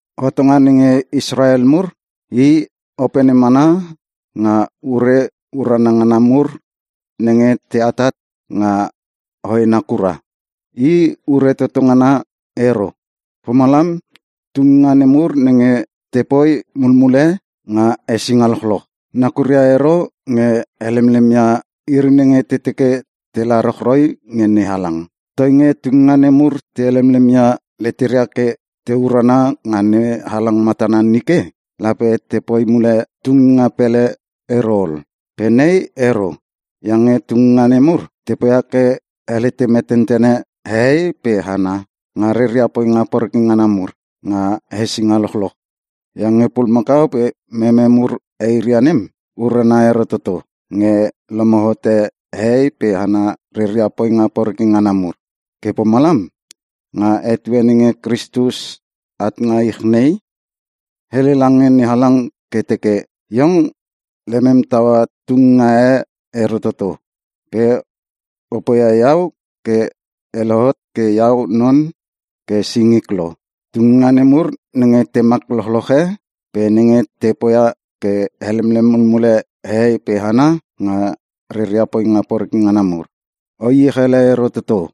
Hotonga nenge Israel mur, i opene mana nga ure urana ngana mur nenge te atat nga hoena kura. I ure toto ngana ero. Pomalam, tunginga nemur nenge te poi mulmule nga hesinga lochloch, nakuria ero nge helemlem ia iri nenge te teke tela rochroi nge NeHalang. Toinge tunginga nemur te helemlem ia leteria ke te urana nga NeHalang matana nike, lape te poi mule tunginga pele ero ol. Pe nei ero. Iange tunginga nemur, te poia ke helete metentene hehei pe hana nga reria poinga poreke ngana mur nga hesinga lochloch. Iange pulumakau pe meme mur eiria nem, urana ero toto nge lomo hote hehei pe hana reria poinga poreke ngana mur. Ke pomalam, nga etue nenge Kristus at nga ich nei, hele lange NeHalang ke teke, “Iong lemem taua tunginga e ero toto. Pe o poia Iau ke E lohot ke Iau non ke singik lo. Tunginga nemur nenge temak lochloche pe nenge te poia ke helemlem mulmule hehei pe hana nga reria poinga poreke ngana mur, O iech ele ero toto.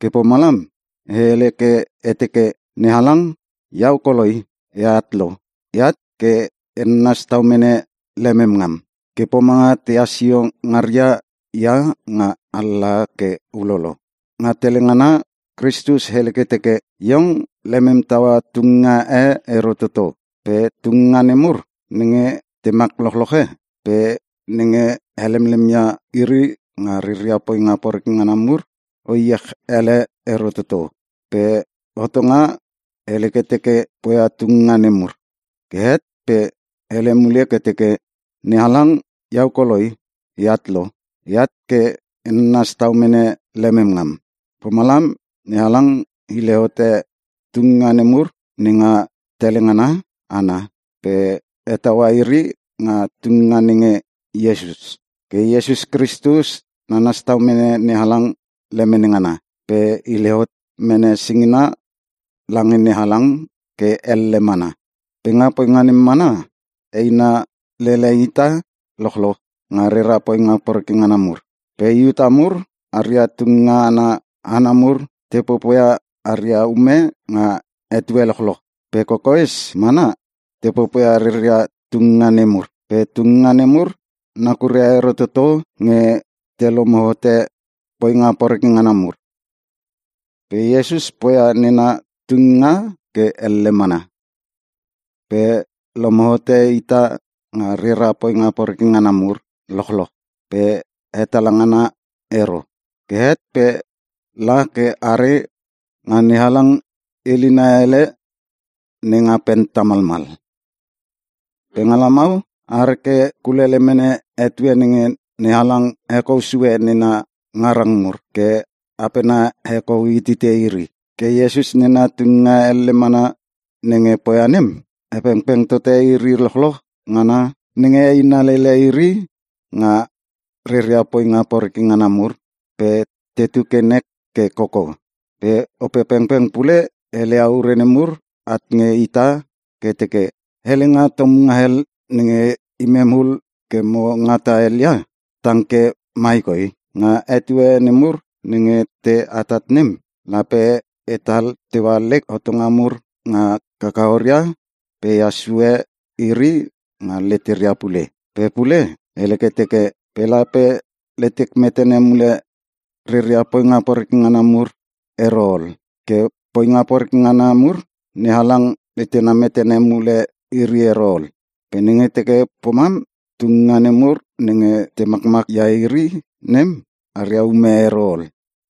Ke pomalam E hele ke E teke, ‘NeHalang, Iau koloi E at lo. E at ke E nanas tau mene lemem ngam ke pomanga tehas sio ngaria ia nga alalaha ke ulolo.’” Nga tele ngana Kristus hele ke teke, “Iong lemem taua tunginga e ero toto. Pe tunginga nemur nenge temak lochloche pe nenge helemlem ia iri nga reria poinga poreke ngana mur, o iech ele ero toto.” (Pe hotonga hele ke teke te poia tunginga nemur.) Ke het pe hele mule ke teke, “NeHalang, Iau koloi E at lo. E at ke E nanas tau mene lemem ngam.” Pomalam NeHalang hile hote tunginga nemur nenga tele ngana ana pe hetaua iri nga tunginga nenge Iesus. Ke Iesus Kristus nanas tau mene NeHalang lemene ngana, pe hile hot mene singina lange NeHalang ke elle mana. Pe nga poinga nem mana, eina lele ita lochloch nga rera poinga poreke ngana mur. Pe Iuta mur, aria tunginga ana hana mur te popoia aria ume nga etue lochloch. Pe kokoes mana te popoia reria tunginga nemur. Pe tunginga nemur nakuria ero toto nge te lomo hote poinga poreke ngana mur. Pe Iesus poia nena tunginga ke elle mana, pe lomo hote ita nga rera poinga poreke ngana mur lochloch pe hetala ngana ero. Ke het pe la ke are nga NeHalang ilina ele nenga pen tamalmal. Pe nga lamau, are ke kulele mene etue nenge NeHalang hekou sue nena ngarang mur ke apena hekou hitite iri. Ke Iesus nena tunginga elle mana nenge poia nem, hepengpeng tote iri lochloch ngana nenge eina lele iri nga reria poinga poreke ngana mur pe tetu ke nek ke koko. Pe Opepengpeng pule heleia ure nemur at nge ita ke teke, “Helenga tomunga hel nenge imem ul ke mo ngata hel ia, tang ke mai koi. Nga etue nemur nenge te atat nem, lape E tal teua lek hotonga mur nga kakaoria pe Ehas sue iri nga leteria pule” Pe pule hele ke teke, “Pe lape letek metene mule reria poinga poreke ngana mur ero ol.” Ke poinga poreke ngana mur, NeHalang letena metene mule iri ero ol. Pe nenge teke pomam tunginga nemur nenge te makmak ia iri nem aria ume ero ol.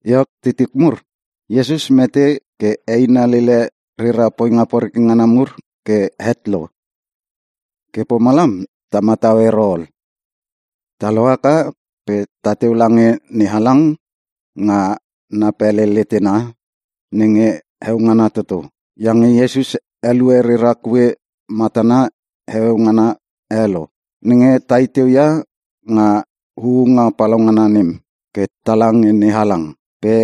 Iok titik mur, Iesus mete ke eina lele rera poinga poreke ngana mur ke het lo. Ke pomalam ta matau ero ol. Ta lohaka pe tateu lange NeHalang nga na pele letena nenge heo ngana toto. Iange Iesus elue rera kue matana heueu ngana e lo, nenge ta i teu ia nga huunga palaungana nem ke tala nge NeHalang. Pe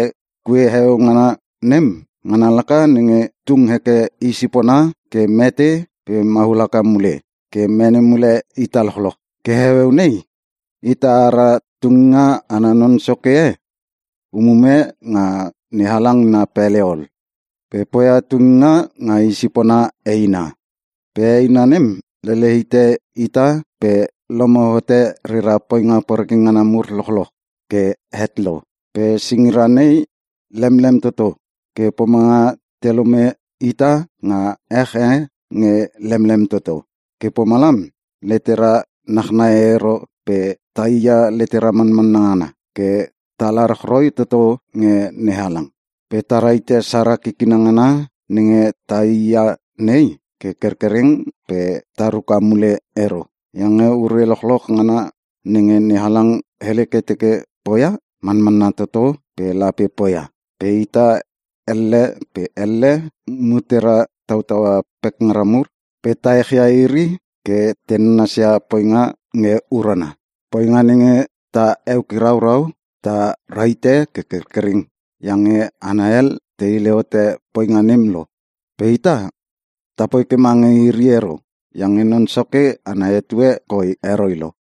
kue heueu ngana nem, ngana laka nenge tung heke I sipona ke mete pe maul haka mule ke mene mule ita lochloch. Ke heueu nei, ita ara Tunginga ana Non Soke e umume nga NeHalang na pele ol. Pe poia tunginga nga I sipona eina. Pe eina nem lele hite ita pe lomo hote rera poinga poreke ngana mur lochloch ke het lo. Pe singira nei lemlem toto ke pomanga te lome ita nga ech e nge lemlem toto. Ke pomalam letera nachnai ero pe tai ia letera manmanna ngana, ke tala rochroi toto nge NeHalang. Pe ta rahite sara kikina ngana nenge taii ia nei ke kerkereng pe ta ruka mule ero. Iange ure lochloch ngana nenge NeHalang hele ke teke poia, manmanna toto ke lape poia. Pe ita elle pe elle mutera tautaua pekngara mur, pe ta ech ia iri ke te nanasia poinga nge urana. Poinga nenge ta eukiraurau, ta rahite ke kerkereng iange hana hel te hile hote poinga nem lo. Pe ita, ta poi ke mange iri ero iange Non Soke ana etue koi heroi lo.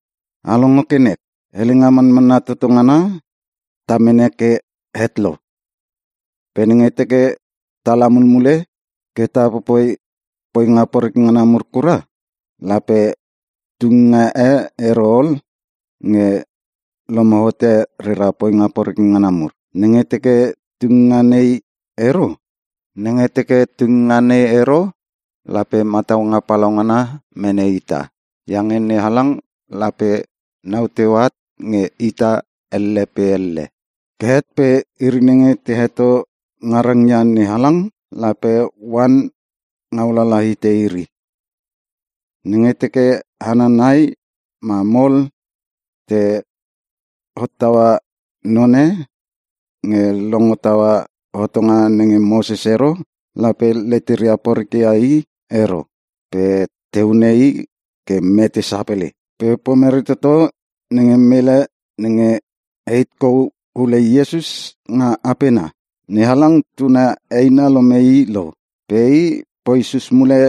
A longo ke nek, helenga manmanna toto ngana ta mene ke het lo. Pe nenge teke tala mulmule ke ta popoi poinga poreke ngana mur kura, lape tunginga e ero ol nge lomo hote rera poinga poreke ngana mur. Nenge teke tunginga nei ero, lape mataunga palaungana mene ita. Iange NeHalang lape nau teu at nge ita elle pe elle. Ke het pe iri nenge te heto ngarang ia NeHalang, lape oan ngau lala hite iri. Nenge teke hana nai ma mol te hottaua none nge longo taua hotonga nenge Moses ero, lape leteria poreke ia i ero pe te hune i ke mete sapele. Pe pomere toto nge mele nenge heit kou hule Iesus nga apena? NeHalang tuna eina lome i lo. Pe i poi sus mule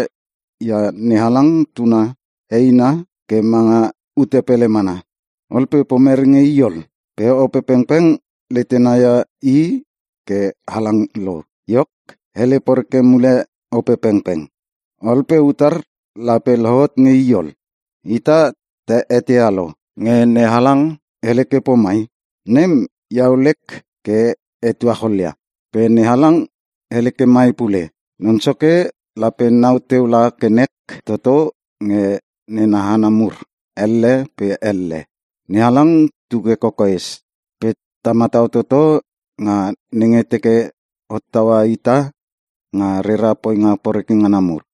ia NeHalang Tuna eina ke manga ute pele mana. Ol pe pomere nge i ol? Pe Opepengpeng letena ia i ke halang lo. Iok, hele poreke mule Opepengpeng. Ol pe utar lape lohot nge i ol? Ita ta eteia lo, nge NeHalang hele ke pomai, “Nem, Iau lek ke e tuachol ia.” Pe NeHalang hele ke mai pule, “Non Soke lape nau teu la ke nek toto nge nena hana mur elle pe elle.” NeHalang tu ke kokoes pe ta matau toto nga nenge teke hotaua ita nga rera poinga poreke ngana mur.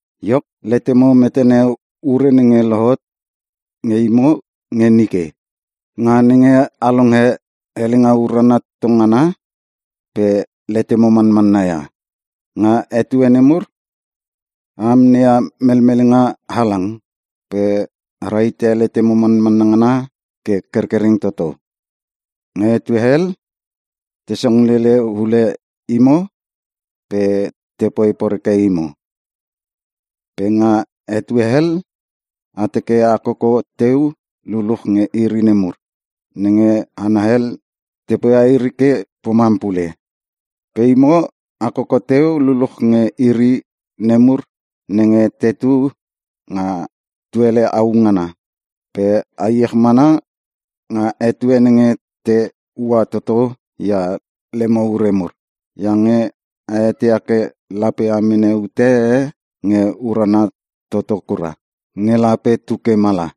Iok, letemo metene ure nenge lohot nge imo nge nike, nga nenge a longe helenga urana toto ngana pe letemo manmanna ia. Nga etue nemur, a amneia melmelenga halang pe a rahite letemo manmanna ngana ke kerkereng toto. Nga etue hel, te song lele hule imo pe te poi poreke imo. Pe nga etue hel, a teke a koko teu luluch nge iri nemur, nenge hana hel te poia iri ke pomam pule. Pe imo a koko teu luluch nge iri nemur nenge tetu nga tuele au ngana, pe a iech mana nga etue nenge te ua toto ia lemo ure mur, iange a eteia ke lape a mene ute e nge urana toto kura, nge lape tu ke mala.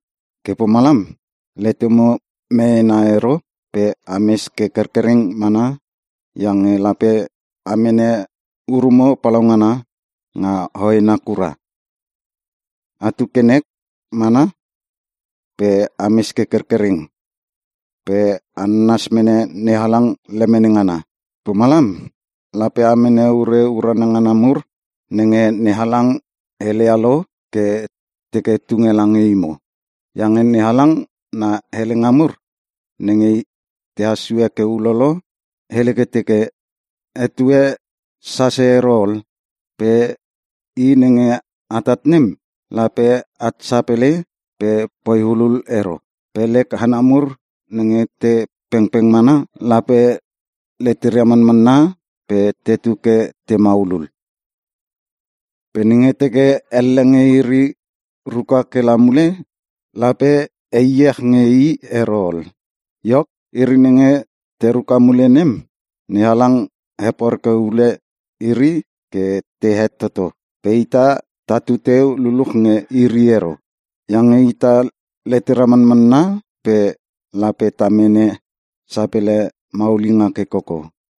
Ke pomalam letemo meena ero pe a mes ke kerkereng mana iange lape a mene urumo palaungana nga hoena kura. Atu ke nek mana pe ames ke kerkereng pe a nanas mene NeHalang lemene ngana. Pomalam lape a mene ure urana ngana mur nenge NeHalang heleia lo ke teke tunge lange imo. Iange NeHalang na helenga mur nenge tehas sue ke ulolo, hele ke teke, “Etue sase ero ol pe i nenge atat nem lape at sapele pe poi hulul ero. Pe lek hana mur nenge te pengpeng mana, lape leteria manmanna pe tetu ke te maulul. Pe nenge teke elle nge iri ruka ke la mule, lape e iech nge i ero ol.” Iok, iri nenge te ruka mule nem, NeHalang heporeke hule iri ke te het toto. Pe ita tatu teu luluch nge iri ero. Iange ita letera manmanna pe lape ta mene sapele maulinga ke koko.